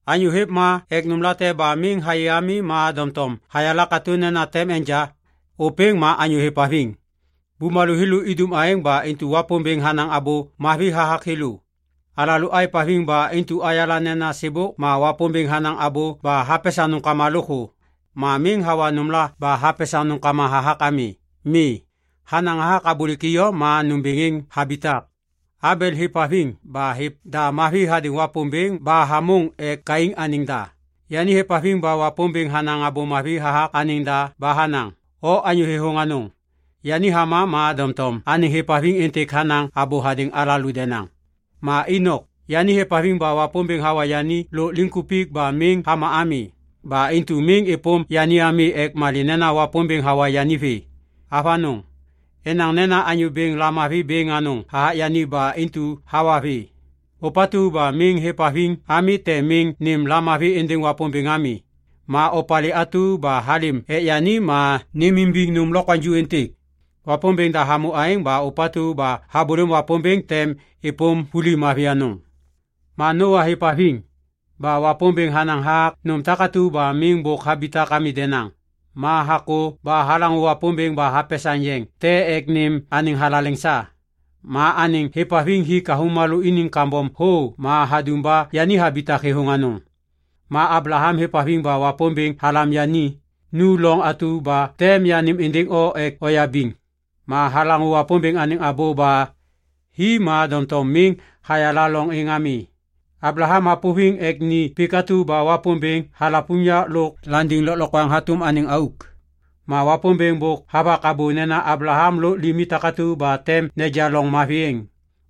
Anyô hêv ma ek nômlate ba miŋ hayê ami ma doŋtom hayala katô nena tem enja, ôpêŋ ma anyô hêvhaviŋ. Bumalô thêlô idum aêŋ ba intu Wapômbêŋ hanaŋ abô mavi hathak thêlô. Alalô êvhaviŋ ba intu ayala nena sêbôk ma Wapômbêŋ hanaŋ abô ba hapesaŋ nômkama lôkthô. Ma miŋ hawa nômla ba hapesaŋ nômkama hathak ami. Mi, hanaŋ hathak abôlêk iyom ma nômbêŋ êŋ habitak. Abel hêvhaviŋ ba hêv da mavi hadêŋ Wapômbêŋ ba hamôŋ ek Kain anêŋ da. Yani hêvhaviŋ ba Wapômbêŋ hanaŋ abô mavi hathak anêŋ da ba hanaŋ, “O anyô thêthôŋ anôŋ.” Yani hama ma doŋtom anêŋ hêvhaviŋ êntêk hanaŋ abô hadêŋ alalô denaŋ. Ma Inok, yani hêvhaviŋ ba Wapômbêŋ hawa yani lôk liŋkupik ba miŋ hama ami. Ba intu miŋ êpôm yani ami ek malê nena Wapômbêŋ hawa yani vê. Avanôŋ. Enaŋ nena Anyô Bêŋ lamavi bêŋ anôŋ hathak yani ba intu hawa vê. Ôpatu ba miŋ hêvhaviŋ ami tem miŋ nêm lamavi êndêŋ Wapômbêŋ ami. Ma opalê atu ba halêm ek yani ma nêmimbiŋ nôm lokwaŋju êntêk. Wapômbêŋ da hamô aêŋ ma ôpatu ba habôlêm Wapômbêŋ tem êpôm vuli mavi anôŋ. Ma Noa hêvhaviŋ. Ba Wapômbêŋ hanaŋ hathak nôm takatu ba miŋ bôk habitak ami denaŋ. Ma hakô ba halaŋô Wapômbêŋ ba hapesaŋ yeŋ te ek nêm anêŋ thalaleŋ sa. Ma anêŋ hêvhaviŋ hik avômalô iniŋ kambom thô ma hadum ba yani habitak thêthôŋ anôŋ. Ma Ablaham hêvhaviŋ ba Wapômbêŋ halam yani, “Nu loŋ atu ba tem yanêm êndêŋ o ek oyabiŋ.” Ma halaŋô Wapômbêŋ anêŋ abô ba hi ma doŋtom miŋ hayala loŋ êŋ ami. Ablaham hapôviŋ ek ni pik atu ba Wapômbêŋ halav unyak lôk landiŋ lôklokwaŋ hatôm anêŋ auk. Ma Wapômbêŋ bôk havak abô nena Ablaham lôk limi takatu ba tem neja loŋ mavi êŋ.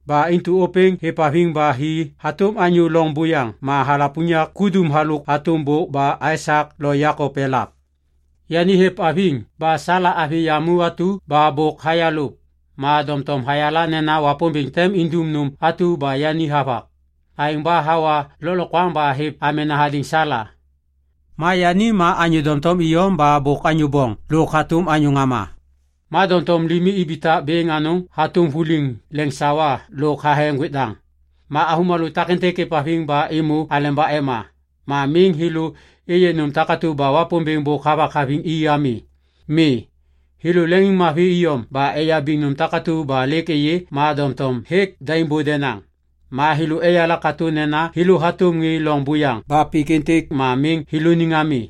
Ba intu ôpêŋ hêvhaviŋ ba hi hatôm anyô loŋ buyaŋ ma halav unyak kudum halôk hatôm bôk ba Aisak lo Jekop elav. Yani hêvhaviŋ ba Sala avi yamu atu ba bôk hayalôv. Ma doŋtom hayala nena Wapômbêŋ tem indum nôm atu ba yani havak. Aêŋ ba hawa lôklokwaŋ ba hêv amena hadêŋ Sala. Ma yani ma anyô doŋtom iyom ba bôk anyô boŋ lôk hatôm anyô ŋama. Ma doŋtom limi ibitak bêŋ anôŋ hatôm vuliŋ leŋsawa lôk thathe ŋgwêk daŋ. Ma avômalô takêntêk êvhaviŋ ba êmô aleba ema. Ma miŋ thêlô êyê nôm takatu ba Wapômbêŋ bôk havak haviŋ i ami. Mi. Thêlô leŋiŋmavi iyom ba eyabiŋ nôm takatu ba lêk êyê ma doŋtom hêk daimbô denaŋ. Ma thêlô eyala katô nena thêlô hatôm ŋê loŋ buyaŋ ba pik êntêk ma miŋ thêlôniŋ ami.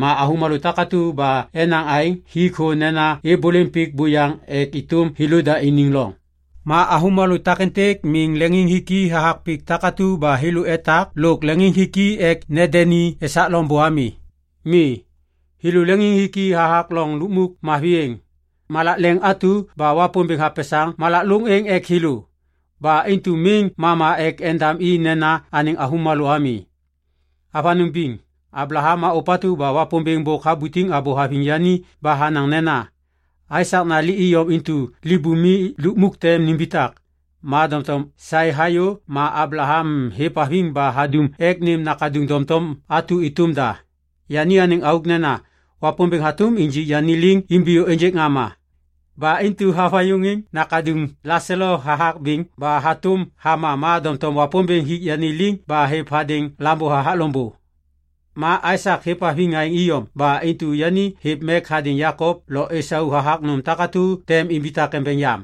Ma avômalô takatu ba enaŋ aêŋ hik thô nena êbôlêm pik buyaŋ ek êtôm thêlôda iniŋ loŋ. Ma avômalô takêntêk miŋ leŋiŋhiki hathak pik takatu ba thêlô etak lôk leŋiŋhiki ek nendeni esak loŋbô ami. Mi. Thêlô leŋiŋhiki hathak loŋ lukmuk mavi êŋ, malak leŋ atu ba Wapômbêŋ hapesaŋ malak lôŋ êŋ ek thêlô. Ba intu miŋ mama ek endam i nena anêŋ avômalô ami. Avanôŋ biŋ! Ablaham ma ôpatu ba Wapômbêŋ bôk habutiŋ abô haviŋ yani ba hanaŋ nena, “Aisak nali iyom intu libumi lukmuk tem nimbitak.” Ma doŋtom saê hayô ma Ablaham hêvhaviŋ ba hadum ek nêm nakaduŋ doŋtom atu êtôm da. Yani anêŋ auk nena, “Wapômbêŋ hatôm injik yani liŋ imbiyô ênjêk ŋama.” Ba intu havayuŋiŋ nakaduŋ laselo hathak biŋ ba hatôm hama ma doŋtom Wapômbêŋ hik yani liŋ ba hêv hadêŋ lambô hathak loŋbô. Ma Aisak hêvhaviŋ aêŋ iyom ba intu yani hêv mek hadêŋ Jekop lo Isau hathak nôm takatu tem imbitak embeŋ yam.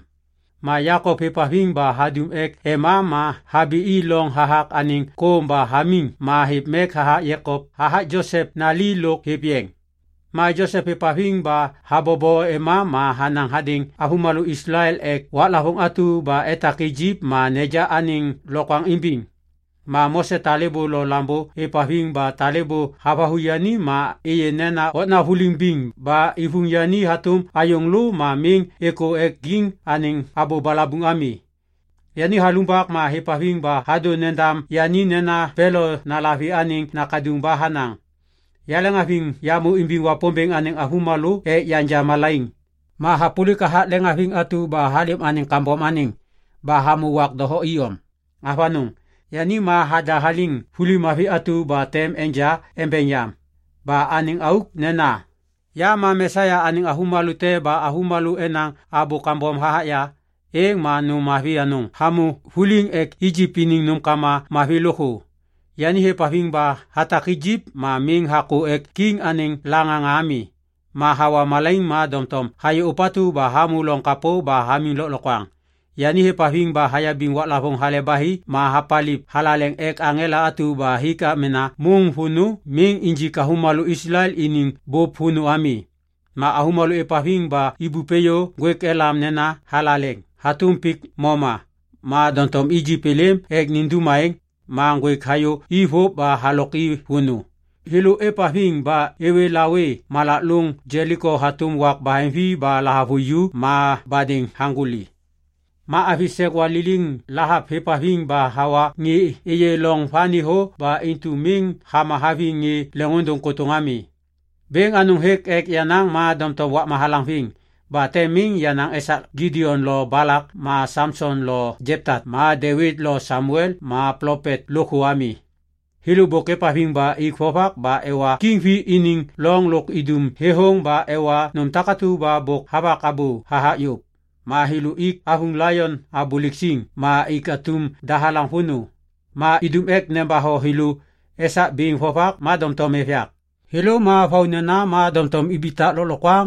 Ma Jekop hêvhaviŋ ba hadum ek ema ma habi i loŋ hathak anêŋ kôm ba hamiŋ ma hêv mek hathak Josep nali lôk hêv yeŋ. Ma Josep hêvhaviŋ ba habobo ema ma hanaŋ hadêŋ avômalô Islael ek waklavôŋ atu ba etak Ijip ma neja anêŋ lokwaŋ imbiŋ. Ma Mose talêbô lo lambô êvhaviŋ ba talêbô havathu yani ma êyê nena okna vuliŋ biŋ ba ivuŋ yani hatôm ayôŋ lô ma miŋ êkô ek kiŋ anêŋ abô balabuŋ ami. Yani halumbak ma hêvhaviŋ ba hadô nendam yani nena Pelo nalavi anêŋ nakaduŋ ba hanaŋ, “Yaleŋhaviŋ yamô imbiŋ Wapômbêŋ anêŋ avômalô ek yanja malaiŋ. Ma yahapôlik hathak leŋmavi atu ba halêm anêŋ kambom anêŋ ba hamô wak doho iyom.” Avanôŋ. Yani ma hadahaliŋ vuli mavi atu ba tem enja embeŋ yam. Ba anêŋ auk nena, “Ya ma Mesia anêŋ avômalô te ba avômalô enaŋ abô kambom hathak ya, êŋ ma nôm mavi anôŋ hamô vuliŋ ek Ijip iniŋ nômkama mavi lôkthô.” Yani hêvhaviŋ ba hatak Ijip ma miŋ hakô ek kiŋ anêŋ laŋaŋa ami. Ma hawa malaiŋ ma doŋtom hayê ôpatu ba hamô loŋ kapô ba hamiŋ lôklokwaŋ. Yani hêvhaviŋ ba hayabiŋ waklavôŋ Hale ba Hi ma hapaliv thalaleŋ ek aŋela atu ba hik amena môŋ vônô miŋ injik avômalô Islael iniŋ bôp vônô ami. Ma avômalô êvhaviŋ ba ibup êyô ŋgwêk elam nena “Thalaleŋ” hatôm pik moma. Ma doŋtom Ijip êlêm ek nindum aêŋ, ma ŋgwêk hayô i vôv ba halok i vônô. Thêlô êvhaviŋ ba êwê lawê malak lôŋ Jeliko hatôm wak baheŋvi ba lahavuju ma badêŋ haŋgôli. Ma avi sek waliliŋ Lahap hêvhaviŋ ba hawa ŋê êyê loŋ vani thô ba intu miŋ hama haviŋ ŋê leŋôndôŋ kôtôŋ ami. Bêŋ anôŋ hêk ek yanaŋ ma doŋtom wakma halaŋviŋ. Ba tem miŋ yanaŋ esak Gidion lo Balak ma Samson lo Jepta ma Devit lo Samuel ma plopet lôkthô ami. Thêlô bôk êvhaviŋ ba ik vovak ba ewa kiŋ vi iniŋ loŋ lôk idum thêthôŋ ba ewa nôm takatu ba bôk havak abô hathak yôv. Ma thêlô ik avuŋ laion abôlêk siŋ ma ik atum dahalaŋ vônô. Ma idum ek nembatho thêlô esak biŋ vovak ma doŋtom êv yak. Thêlô ma vaunena ma doŋtom ibitak lôklokwaŋ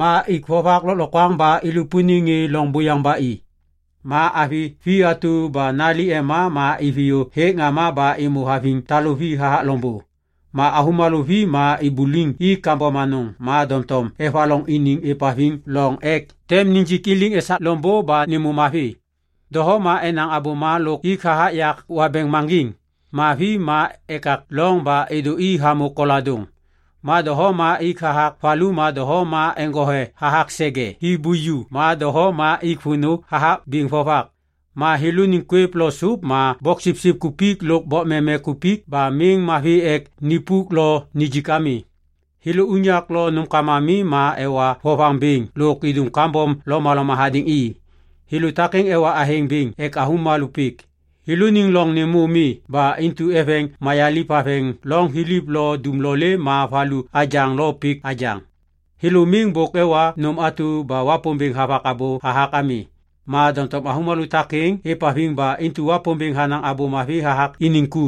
ma ik vovak lôklokwaŋ ba ilupuniŋ ŋê loŋ buyaŋ ba i. Ma avi vi atu ba nali ema ma iviyô hêk ŋama ba êmô haviŋ taluvi hathak loŋbô. Ma avômalô vi ma ibuliŋ i kambom anôŋ ma doŋtom evaloŋ iniŋ êvhaviŋ loŋ ek tem nijik i liŋ esak loŋbô ba nêmô mavi. Doho ma enaŋ abôma lôk ik hathak yak wabeŋ maŋgiŋ. Ma vi ma ekak loŋ ba êdô i hamô koladôŋ. Ma doho ma ik hathak valu ma doho ma eŋgothe hathak sege hi buju ma doho ma ik vônô hathak biŋ vovak. Ma thêlôniŋ kwêv lo sôp ma boksipsip kupik lôk bokmeme kupik ba miŋ mavi ek nipuk lo nijik ami. Thêlô unyak lo nômkama mi ma ewa vovaŋ bêŋ lôk idum kambom lomaloma hadêŋ i. Thêlô takêŋ ewa athêŋ bêŋ ek avômalô pik. Thêlôniŋ loŋ nêmô mi ba intu eveŋ mayaliv haveŋ loŋ thiliv lo dumlolê ma valu abyaŋ lo pik abyaŋ. Thêlô miŋ bôk ewa nôm atu ba Wapômbêŋ havak abô hathak ami. Ma doŋtom avômalô takêŋ êvhaviŋ ba intu Wapômbêŋ hanaŋ abô mavi hathak iniŋ ku.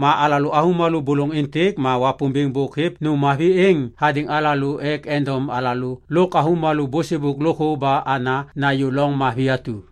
Ma alalô avômalô bôlôŋ êntêk ma Wapômbêŋ bôk hêv nôm mavi êŋ hadêŋ alalô ek endom alalô lôk avômalô bôsêbôk lôkthô ba ana nayô loŋ mavi atu.